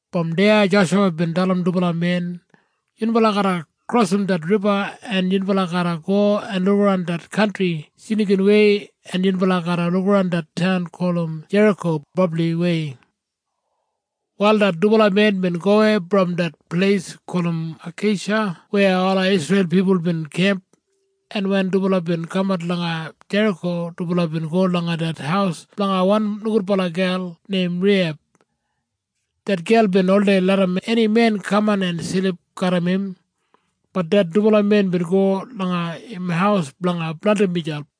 Brom deya Joshuwa bin dalim dubala men, “Yunbala garra krosim det riba, en yunbala garra go en lukaran det kantri snikinwei, en yunbala garra lukaran det taun gulum Jeriko brabliwei.” Wal det dubala men bin gowei brom det pleis gulum Akeisha weya ola Isreil pipul bin kemp, en wen dubala bin kamat langa Jeriko, dubala bin go langa det haus blanga wan nogudbala gel neim Reiheb. Det gel bin oldei larram eni men kaman en silip garram im. Bat det dubala men bin go langa im haus blanga blandim miselp.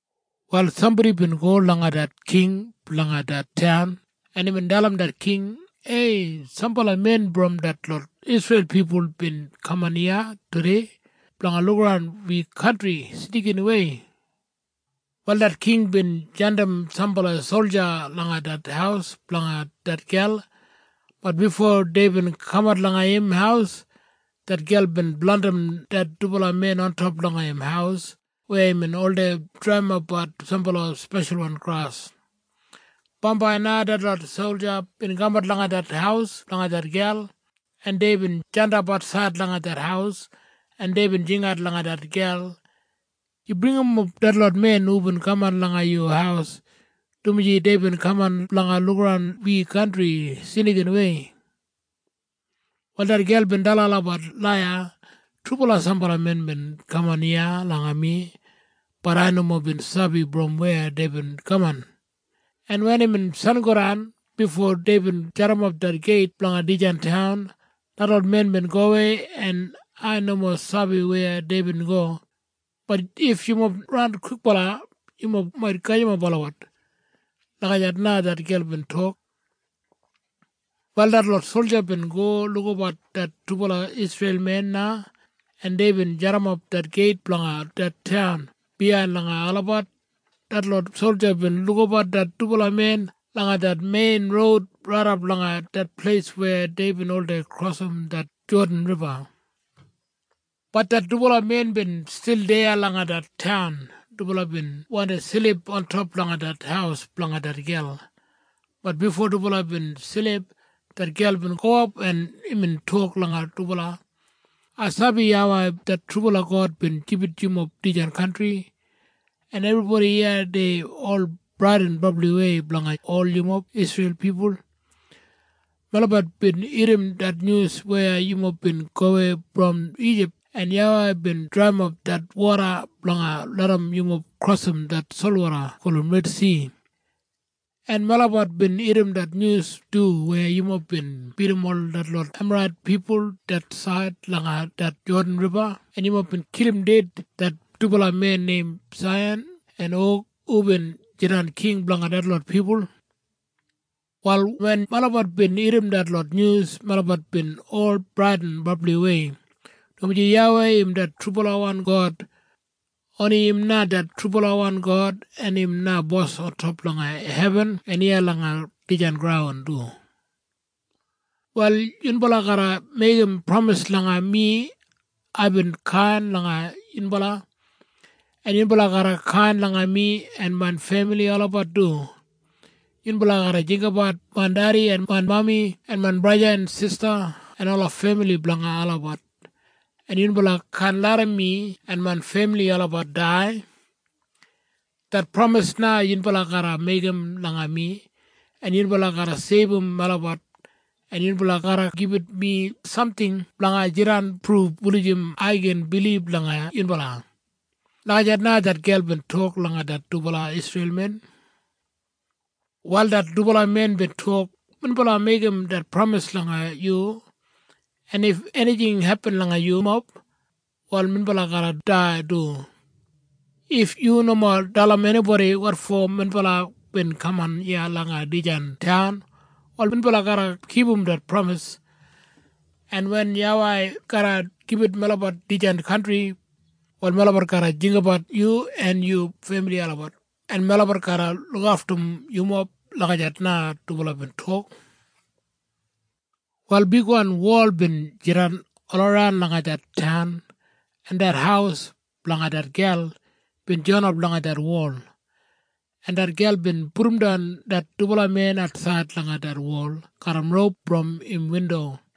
Wal sambodi bin go langa det king blanga det taun, en imbin dalim det king, “Ei! Sambala men brom detlot Isreil pipul bin kaman iya tudei blanga lukaran wi kantri snikinwei.” Wal det king bin jandim sambala solja langa det haus blanga det gel. Bat bifo deibin kamat langa im haus, det gel bin blandim det dubala men ontop langa im haus weya imbin oldei draiyimbat sambala speshalwan gras. Bambai na detlot solja bin kamat langa det haus blanga det gel, en deibin jandap atsaid langa det haus, en deibin jingat langa det gel, “Yu bringimap detlot men hubin kaman langa yu haus, dumaji deibin kaman blanga lukaran wi kantri snikinwei.” Wal det gel bin dalim olabat laiya, “Trubala sambala men bin kaman iya langa mi. Bat ai nomo bin sabi brom weya deibin kaman, en wen imbin sangodan bifo deibin jadimap det geit blanga dijan taun, detlot men bin gowei, en ai nomo sabi weya deibin go. Bat if yumob ran kwikbala, yumob mait gajimap olabat.” Lagijat na det gel bin tok. Wal detlot solja bin go lukabat det dubala Isreil men na, en deibin jadimap det geit blanga det taun biyain langa olabat. Detlot solja bin lukabat det dubala men langa det mein roud raidap langa det pleis weya deibin oldei krosim det Jodan Riba. Bat det dubala men bin stil deya langa det taun. Dubala bin wandi silip ontop langa det haus blanga det gel. Bat bifo dubala bin silip, det gel bin gowap, en imbin tok langa dubala, “Ai sabi YAWEI det trubala God bin gibit yumob dijan kantri. En ebribodi iya dei ol bradin brabliwei blanga ol yumob Isreil pipul. Melabat bin irrim det nyus weya yumob bin gowei brom Ijip en YAWEI bin draiyimap det woda blanga larram yumob krosim det solwoda gulum Redsi. En melabat bin irrim det nyus du weya yumob bin bidim ol detlot Emarait pipul det said langa det Jodan Riba en yumob bin kilim ded det dubala men neim Saihan en Og hubin jidan king blanga detlot pipul. “Wal wen melabat bin irrim detlot nyus, melabat bin ol bradin brabliwei, dumaji YAWEI im det trubalawan God. Oni im na det trubalawan God, en im na bos ontop langa hebin en iya langa dijan graun du. “Wal yunbala garra meigim pramis langa mi. Aibin kain langa yunbala. En yunbala garra kain langa mi en main femili olabat du. Yunbala garra jinggabat main dedi en main mami en main braja en main sista en ola femili blanga olabat. En yunbala kaan larram mi en main femili olabat dai. Det pramis na yunbala garra meigim langa mi, en yunbala garra seibum melabat. En yunbala garra gibit mi samting blanga jidan pruf wulijim ai gin bilib langa yunbala.” Lagijat na det gel bin tok langa det dubala Isreil men. Wal det dubala men bin tok, “Minbala meigim det pramis langa yu. En if enijing hepin langa yumob, wal minbala garra dai du. If yu nomo dalim enibodi wotfo minbala bin kaman iya langa dijan taun, wal minbala garra kipum det pramis. En wen YAWEI garra gibit melabat dijan kantri, wal melabat garra jinggabat yu en yu femili olabat, en melabat garra lukaftum yumob.” Lagijat na dubala bin tok. Wal bigwan wol bin jidan olaran langa det taun, en det haus blanga det gel bin joinap langa det wol, en det gel bin pudumdan det dubala men atsaid langa det wol garram roup brom im windo,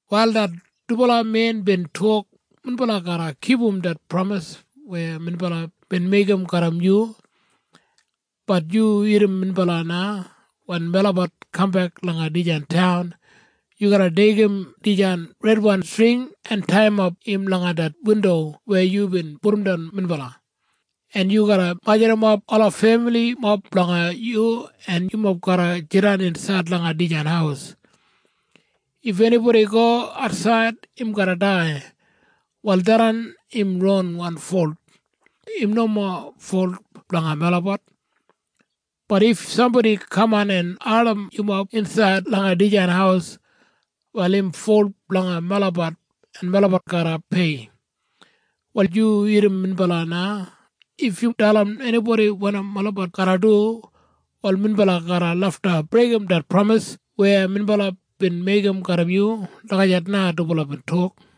Wal det dubala men bin tok, “Minbala garra kipum det pramis weya minbala bin meigim garram yu. Bat yu irrim minbala na. Wen melabat kambek langa dijan taun, yu garra deigim dijan redwan string en taiyimap im langa det windo weya yubin pudumdan minbala, en yu garra majurrumap ola femilimob blanga yu, en yumob garra jidan insaid langa dijan haus. If enibodi go atsaid, im garra dai. Wal tharran im ronwan folt. Im nomo folt blanga melabat. Bat if sambodi kaman en ardim yumob insaid langa dijan haus, wal im folt blanga melabat, en melabat garra pei. Wal yu irrim minbala na. If yu dalim enibodi wanim melabat garra du, wal minbala garra lafta breigim det pramis weya minbala bin meigim garram yu.” Lagijat na dubala bin tok.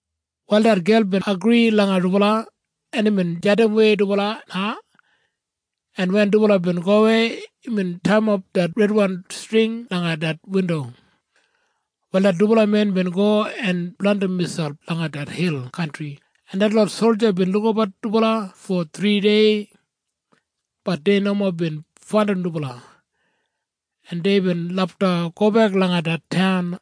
Wal det gel bin agri langa dubala, en imbin jandimwei dubala na, en wen dubala bin gowei, imbin taiyimap det redwan string langa det windo. Wal det dubala men bin go en blandim miselp langa det hil kantri, en detlot solja bin lukabat dubala fo thridei. Bat dei nomo bin faindim dubala, en deibin lafta gobek langa det taun.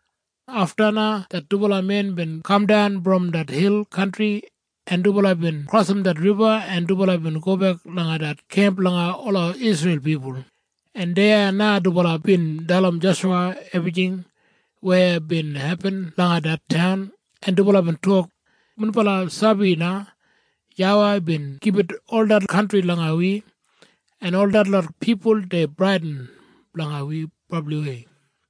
Afta na det dubala men bin kamdan brom det hil kantri, en dubala bin krosim det riba, en dubala bin gobek langa det kemp blanga ola Isreil pipul, en deya na dubala bin dalim Joshuwa ebrijing weya bin hepin langa det taun, en dubala bin tok, “Minbala sabi na, YAWEI bin gibit ol det kantri langa wi, en ol detlot pipul dei bradin blanga wi brabliwei.”